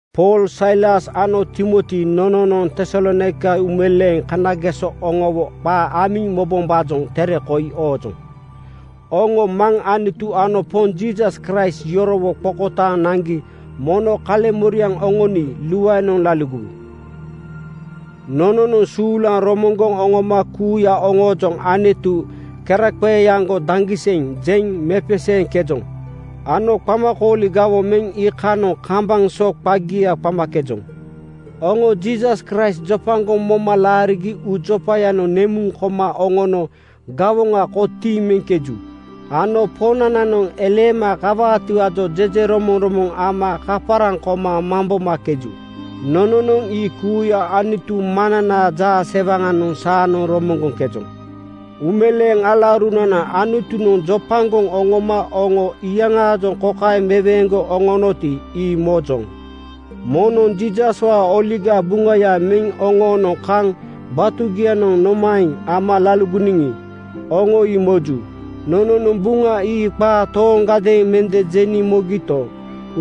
Pool, Sailas ano Timoti nononoŋ Tesalonaika uumeleeŋ kanageso oŋowo qaa amiŋ mobombaajoŋ tere koi oojoŋ. Oŋo Maŋ Anutu ano Poŋ Jiisas Kraist yorowo qokotaaŋ naŋgi mono kaleŋmoriaŋ oŋoni luaenoŋ laligowu. Nononoŋ suulaŋ romoŋgoŋ oŋoma kuuya oŋoojoŋ “Anutu keraqeeaŋgo daŋgiseŋ!” jeŋ mepeseeŋkejoŋ ano qamakooli gawoŋ meŋ iikanoŋ kambaŋ so qagia qamakejoŋ. Oŋo Jiisas Kraist jopagoŋ moma laarigi uujopayanoŋ nemuŋ koma oŋono gawoŋa kotiiŋ meŋkeju ano Poŋnananoŋ eleema kawaatiwaajoŋ jejeromoŋromoŋ ama kaparaŋ koma mambomakeju. Nononoŋ ii kuuya Anutu Maŋnanaa jaasewaŋanoŋ saanoŋ romoŋgoŋkejoŋ. Uumeleeŋ alaurunana, Anutunoŋ jopagoŋ oŋoma oŋo iyaŋaajoŋ kokaeŋ meweeŋgoŋ oŋonoti, ii mojoŋ. Nononoŋ Jiisaswaa Oligaa Buŋaya meŋ oŋoonoŋ kaŋ batugianoŋ nomaeŋ ama laligoniŋi, oŋo ii moju. Nononoŋ Buŋa ii qaa tooŋgadeeŋ mende jeniŋ mogito,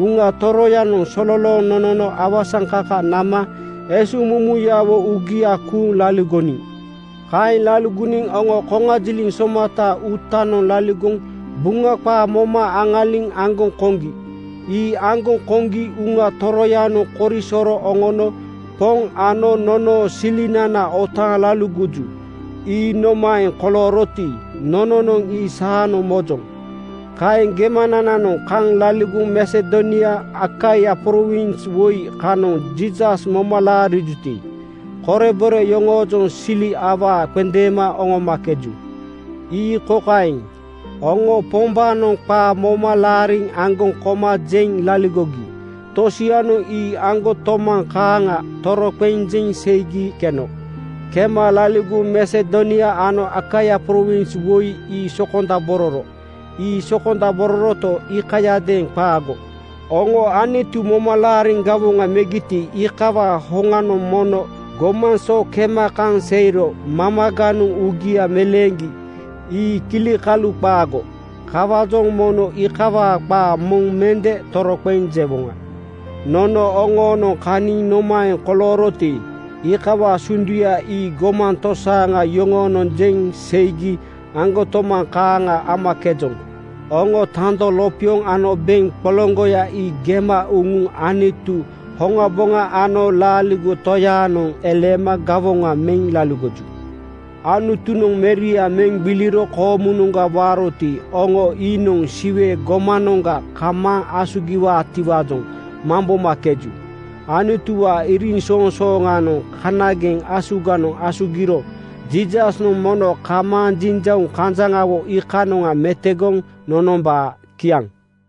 Uŋa Toroyanoŋ sololooŋ nonono awasaŋkaka nama esuŋmumuyawo uugia kuuŋ laligoniŋ. Kaeŋ laligoniŋ oŋo koŋajiliŋ somataa uutanoŋ laligoŋ Buŋa qaa moma aŋaliŋ aŋgoŋ koŋgi. Ii aŋgoŋ koŋgi Uŋa Toroyanoŋ korisoro oŋono Poŋ ano nonoo silinana otaaŋ laligoju. Ii nomaeŋ kolooroti, nononoŋ ii saanoŋ mojoŋ. Kaeŋ gemanananoŋ kaŋ laligoŋ Masedonia Akaia prowins woi kanoŋ Jiisas moma laarijuti, korebore yoŋoojoŋ sili awaa qendeema oŋomakeju. Ii kokaeŋ: Oŋo Pombaanoŋ qaa moma aŋaliŋ aŋgoŋ koma jeŋ laligogi tosianoŋ ii aŋgotomaŋ kaaŋa toroqeŋ jeŋ seigi keno. Kema laligoŋ Masedonia ano Akaia prowins woi ii sokondabororo. Ii sokondabororoto, iikayadeeŋ qaago. Oŋo Anutu moma laariŋ gawoŋa megiti, iikawaa oŋanoŋ mono gomaŋ so kema kaŋ seiro mamaganoŋ uugia meleeŋgi. Ii kilikalu qaago. Kawaajoŋ nono iikawaa qaa moŋ mende toroqeŋ jewoŋa. Nono oŋoonoŋ kaniŋ nomaeŋ kolooroti, iikawaa sunduya ii gomaŋ tosaaŋa yoŋonoŋ jeŋ seigi aŋgotomaŋ kaaŋa momakejoŋ. Oŋo tando lopioŋ ano beŋ qoloŋgoya ii gema uŋuŋ Anutu hoŋaboŋa ano laaligo Toyaanoŋ eleema gawoŋa meŋ laligoju. Anutunoŋ Meria meŋ gbiliro koomunoŋga waaroti, oŋo iinoŋ Siwe gomanoŋga kamaaŋ asugiwaatiwaajoŋ mambomakeju. Anutuwaa iriŋsoŋsooŋanoŋ kanageŋ asuganoŋ asugiro Jiisasnoŋ mono kamaaŋ jiŋjauŋ kanjaŋawo iikanoŋa metogoŋ nonombaa. Kiaŋ.